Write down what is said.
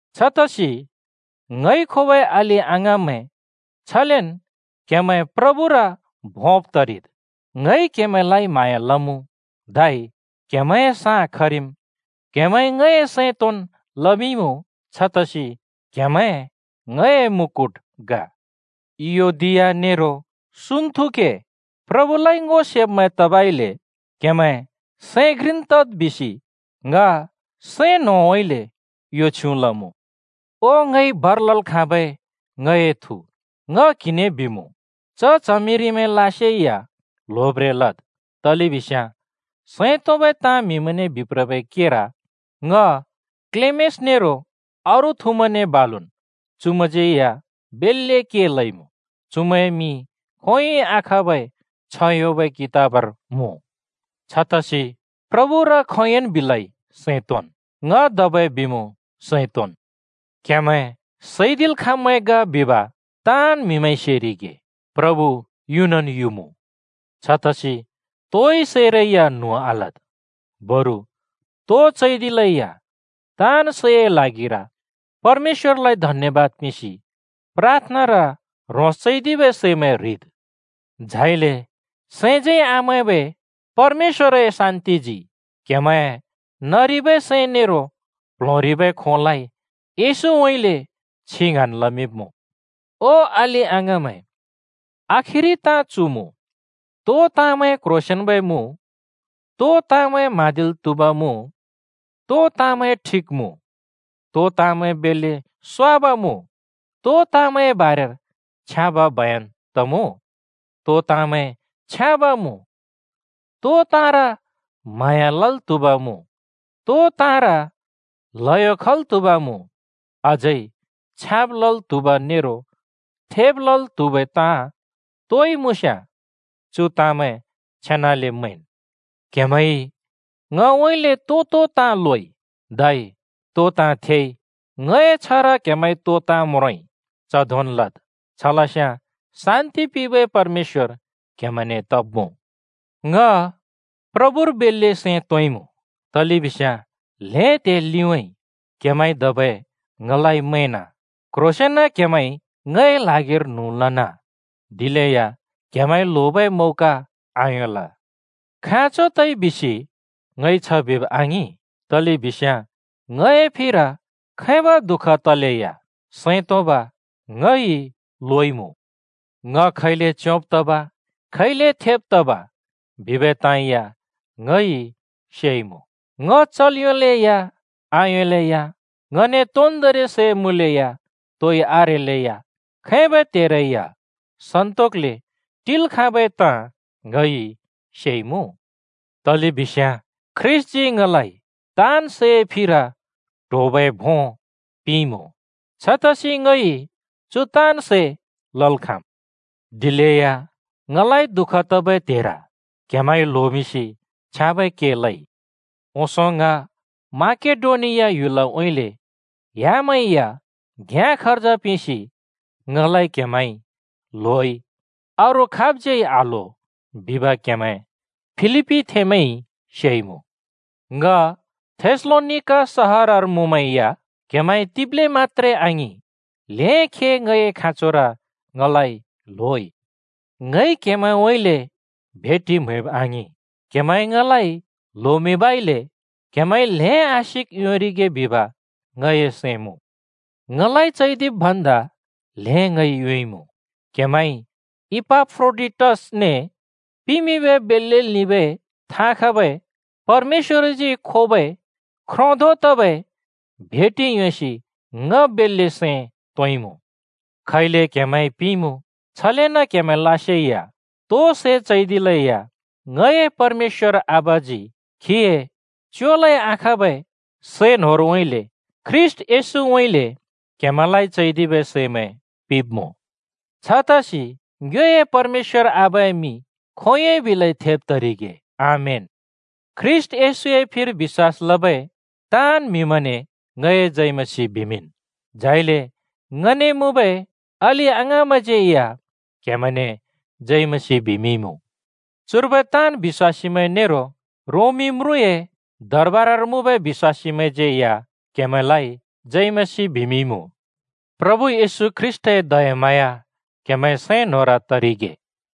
छतसि, ङइ खोबै अलि-अङाँमैं, छलेन् क्हेमैं प्रभुए भोंब् तरिद्। ङइ क्‍हेमैंलाइ म्हाँया लमुँ, धै क्हेमैंए साँ खरिम्। क्हेमैंइ ङए सैं तोंन् लमिंइमुँ छतसि क्हेमैं ङए मुकुट ग। इयोदिया नेरो सुन्‍तुखे प्रभुलाइ ङो सेब्मैं तबइले क्हेमैं सैं घ्रिन् तद् बिसि ङ सैं न्होंउँइँले यो छ्युँ लमुँ। ओ ङइ भर लल् खाँबै ङए थु, ङ क्हिने बिमुँ: “च च्हमिरिमैंलासे या ल्होब्रें लद्।” तलेबिस्याँ सैं तोंबै ताँ म्हिमैंने बिप्रबै केर ङ, क्लेमेस नेरो अरू थुमैंने बालुन् चुमैंज्यै या बेल्‍ले के लइमुँ। चुमैंए मिं खोंयोंइ आखाँबै छ्ह योंबै कितबर मुँ। छतसि प्रभुर खोंयोंन् बिलै सैं तोंन्। ङ धबै बिमुँ, सैं तोंन्। क्हेमैं सैदिल् खाँब्मैं ग बिब ताँन् म्हिमैंइ सेरिगे। प्रभु युनन् युमुँ, छतसि तोइ ताँरै या न्हुँ आलद्, बरु तो चैदिले या ताँन् सैए ल्हागिर परमेश्‍वरलाइ धन्यबाद पिंसि प्राथनार ह्रोंस चैदिबै सैमैं ह्रिद्। झाइले सैंज्यै आमैंबै परमेश्‍वरए शान्‍तिजी क्हेमैंए नरिबै सैं नेरो प्ल्होंरिबै खोंलाइ येशूउँइँले छिं ङ्हाँन् लमिंब्मुँ। ओ अलि-अङाँमैं, आखिरि ताँ चु मुँ: तो ताँमैं क्ह्रोंसेंन्बै मुँ, तो ताँमैं म्हाँदिल् त्हुब मुँ, तो ताँमैं ठिक मुँ, तो ताँमैं बेल्‍ले स्‍वाब मुँ, तो ताँमैंए बारेर छ्याँब बयन तमुँ, तो ताँमैं छ्याँब मुँ, तो ताँर म्हाँया लल् त्हुब मुँ, तो ताँर ल्हयो खल् त्हुब मुँ, अझै छ्याँब लल् त्हुब नेरो थेब लल् त्हुबै ताँ तोइ मुँस्याँ, चु ताँमैं छेनाले मैंन्। क्‍हेमैंइ ङउँइँले तो तो ताँ लोइ, धै तो ताँ थेइ, ङए छ्हर क्हेमैंइ तो ताँ म्रोंइ, च धोंन् लद्। छलस्याँ शान्‍ति पिंबै परमेश्‍वर क्‍हेमैंने तब्‍मुँ। ङ प्रभुर बेल्‍ले सैं तोंइमुँ, तलेबिस्याँ ल्हें त्हिं लिउँइँ क्‍हेमैंइ धबै ङलाइ मैंन। क्ह्रोंसेंन क्हेमैंइ ङए ल्हागिर न्हुँ लन, दिलेया क्हेमैंइ ल्होबै मौका आयोंल। खाँचो तइ बिसि ङइ छ बिब आङिं, तलेबिस्याँ ङए फिर खैबै दुःख तलेया सैं तोंब ङइ लोइमुँ। ङ खैले च्योंब् तब, खैले थेब् तब, बिबै ताँ या ङइ सेइमुँ। ङ चल् योंलेया आयोंलेया, ङने तोन्दोंरि सै मुँलेया तोइ आरेलैया, खैबै त्हेरै या सन्तोकले टिल् खाँबै ताँ ङइ सेइमुँ। तलेबिस्याँ ख्रीष्‍टजी ङलाइ तआन् सैए फिर ट्होबै भों पिंइमुँ। छतसि ङइ चु ताँन् सै लल् खाँम्। दिलेया ङलाइ दुःख तबै त्हेर क्‍हेमैंइ ल्होमिंसि छ्याँबै के लइ। ओंसों ङ माकेडोनिया ह्‍युलउँइँले ह्‍यामाइ या घ्याँ खर्ज पिंसि ङलाइ क्‍हेमैंइ ल्होइ, अरू खाबज्‍यै आल्हो बिब क्‍हेमैं फिलिप्‍पीथेंमैंइ सेइमुँ। ङ थेसलोनिका सहरर मुँमै या क्‍हेमैंइ तिब्‍ले मत्‍त्रे आङिं, ल्हें खे ङए खाँचोर ङलाइ ल्होइ। ङइ क्हेमैंउँइँले भेटि म्‍हैब आङिं, क्‍हेमैंइ ङलाइ ल्होमिंबइले क्हेमैंइ ल्हें आशिक योंरिगे बिब ङए सैं मुँ। ङलाइ चैदिब् भन्दा ल्हें ङइ योंइमुँ। क्‍हेमैंइ इपाफ्रोडिटसने पिमिंबै बेल्‍ले लिंबै थाँ खबै परमेश्‍वरजी खोबै ख्रो धों तबै भेटि योंसि ङ बेल्‍ले सैं तोंइमुँ। खैले क्हेमैंइ पिंइमुँ छलेन क्‍हेमैंलासे या तो सै चैदिलेया, ङए परमेश्‍वरजी खीए च्योलै आखाँबै सै न्होरउँइँले ख्रीष्‍ट येशूउँइँले क्हेमैंलाइ चैदिबै सैमैं पिंब्मुँ। छतसि ङ्योए परमेश्‍वर आबाए मिं खोंयोंइ बिलै थेब तरिगे। आमेन। ख्रीष्‍ट येशूए फिर बिश्‍वास लबै ताँन् म्हिमैंने ङए जय मसीह बिमिंन्। झाइले ङने मुँबै अलि-अङाँमैंज्यै या क्‍हेमैंने जय मसीह बिमिंइमुँ। चुर्बै ताँन् बिश्‍वासीमैंइ, खासगरि रोमी म्रुँए दरबारर मुँबै बिश्‍वासीमैंइ, क्‍हेमैंलाइ जय मसीह बिमिंइमुँ। प्रभु येशू ख्रीष्‍टए दयाम्हाँया क्‍हेमैंए सैं न्‍होंर तरिगे।